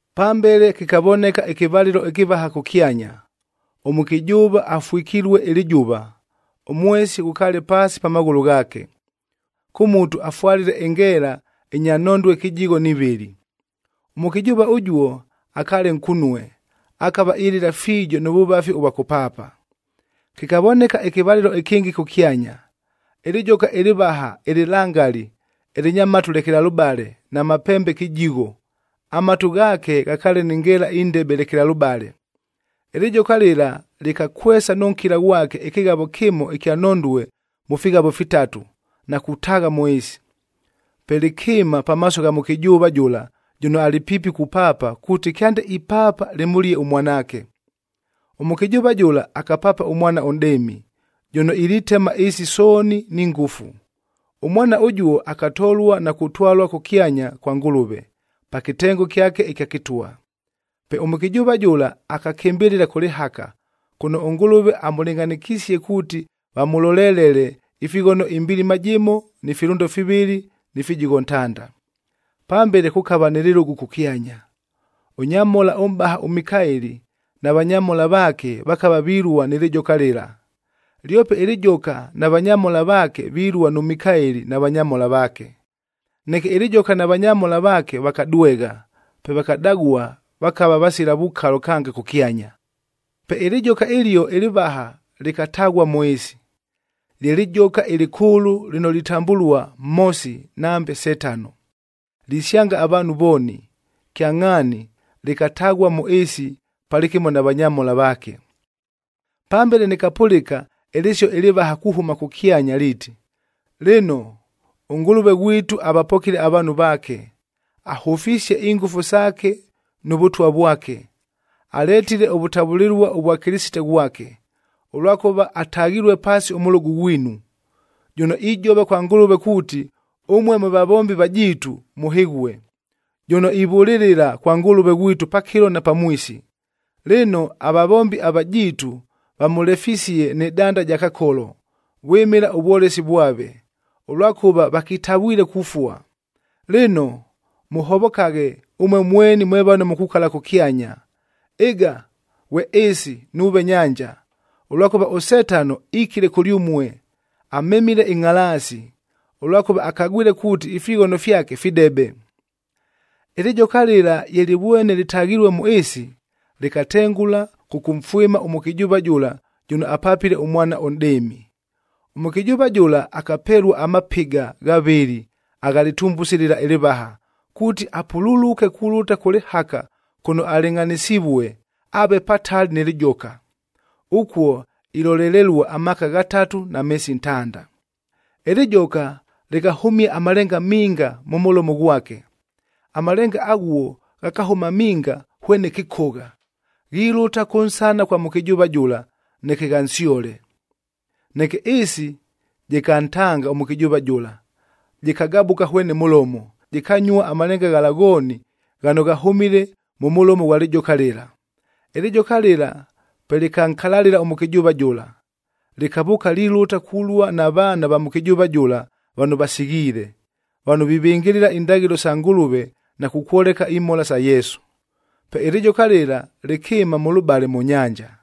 Pambele kɨkavoneka ɨkɨvalɨlo ɨkɨvaha kʉkyanya. Ʉmʉkɨjʉʉva afwɨkilue ɨlɨjʉva, ʉmwesi ghʉkaale paasi pa maghʉlʉ ghaake. Kʉ mutu afwalile ɨngeela ɨnya nhondue kɨjigho ni vɨlɨ. Ʉmʉkɨjʉʉva ʉjuo akaale nkunue, akava ilɨla fiijo nʉ vʉvafi ʉvwa kʉpaapa. Kɨkavoneka ɨkɨvalɨlo ɨkɨngɨ kʉkyanya. Ɨlɨjoka ɨlɨvaha ɨlɨlangali, ɨlɨnya matu lekelalʉbale na mapembe kɨjigho, amatu ghaake ghakaale ni ngeela indebe lekelalʉbale. Ɨlɨjoka lɨla lɨkakwesa nʉ nkɨla ghwake ɨkɨghavo kɨmo ɨkya nhondue mʉ fighavo fitatu, na kutaagha mʉ ɨɨsi. Pe lɨkɨɨma pamaaso gha mʉkɨjʉʉva jʉla jʉno alɨ piipi kupaapa kuuti kyande ipaapa, lɨmʉlie ʉmwanaake. Ʉmʉkɨjʉʉva jʉla akapaapa ʉmwana ʉnʼdɨɨmi, jʉno ilitema ɨɨsi sooni ni ngʉfu. Ʉmwana ʉjuo akatolua na kutwalua kʉkyanya kwa Ngʉlʉve, pa kɨtengo kyake ɨkya kɨtwa. Pe ʉmʉkɨjʉʉva jʉla akakɨmbɨlɨla kʉ lɨhaka, kʉno ʉNgʉlʉve amʉlɨngʼhanɨkisie kuuti vamʉlolelele ifighono ɨmbilima jɨmo ni filʉndo fivɨlɨ ni fijigho ntanda. Pambele kʉkava nɨ lɨlʉgʉ kʉkyanya, ʉnyamhola ʉmʼbaha ʉMikaeli na vanyamhola vaake vakava vilua nɨ lɨjoka lɨla; lyope ɨlɨjoka na vanyamhola vaake vilua nʉ Mikaeli na vanyamhola vaake. Neke ɨlɨjoka na vanyamhola vaake vakadwegha, pe vakadagua vakava vasila vukalo kange kʉkyanya. Pe ɨlɨjoka ɨlio ɨlɨvaha lɨkataghua mʉ ɨɨsi. Lye lɨjoka ɨlɨkʉʉlʉ lɨno litambʉlua Mhosi nambe Setano. Lisyanga avaanhu vooni. Kyangʼhaani lɨkataghua mʉ ɨɨsi palɨkɨmo na vanyamhola vaake. Pambele nɨkapʉlɨka ɨlɨsio ɨlɨvaha kuhʉma kʉkyanya liiti, “Lɨno, ʉNgʉlʉve ghwitu avapokile avaanhu vaake, ahʉfisie ingʉfu saake nʉ Vʉtwa vwake! Aletile ʉvʉtavʉlɨlua ʉvwa Kɨlɨsite ghwake, ʉlwakʉva ataghilue paasi ʉmʉlʉgʉ ghwinu, jʉno ijova kwa Ngʉlʉve kuuti, ʉmue mwe vavombi vajiitu mʉhɨghue, jʉno ivʉlɨlɨla kwa Ngʉlʉve ghwitu pakɨlo na pamwisi. Lɨno, avavombi avajiitu vamʉlefisie nɨ danda ja Kakolo, vwɨmɨla ʉvwolesi vwave, ʉlwakʉva vakitavwile kufua. Lɨno, mʉhovokaghe, ʉmue mweni mwe vano mukukala kʉkyanya! Ɨga ghwe ɨɨsi nuuve nyanja, ʉlwakʉva ʉSetano ikile kʉlyʉmue, amemile ɨngʼhalaasi, ʉlwakʉva akagwile kuuti ifighono fyake fidebe.” Ɨlɨjoka lɨla ye lɨvwene lɨtaghilue mʉ ɨɨsi, lɨkatengʉla kʉkʉmfwɨma ʉmʉkɨjʉʉva jʉla jʉno apapile ʉmwana ʉnʼdɨɨmi. Ʉmʉkɨjʉʉva jʉla akapelua amapɨga ghavɨlɨ agha lɨtumbusi lɨla ɨlɨvaha, kuuti apululuke kulʉta kʉ lɨhaka kʉno alɨngʼhanɨsivue, aave patali nɨ lɨjoka. Ʉkuo ilolelelua amaaka ghatatu na meesi ntanda. Ɨlɨjoka lɨkahʉmia amalenga minga mʉ mʉlomo ghwake. Amalenga aghuo ghakahʉma minga hwene kɨkogha, ghilʉta kʉnsana kwa mʉkɨjʉʉva jʉla, neke ghansyole. Neke ɨɨsi jɨkantanga ʉmʉkɨjʉʉva jʉla, jɨkagabʉka hwene mʉlomo, jɨkanyua amalenga ghala ghooni ghano ghahʉmile mʉ mʉlomo ghwa lɨjoka lɨla. Ɨlɨjoka lɨla pe lɨkankalalɨla ʉmʉkɨjʉʉva jʉla, lɨkavʉʉka lilʉta kulua na vaana va mʉkɨjʉʉva jʉla vano vasighiile, vano vivɨngɨlɨla indaghɨlo sa Ngʉlʉve na kukwoleka imhola sa Yesu. Pe ɨlɨjoka lɨla lɨkɨɨma mʉlʉbale mʉ nyanja.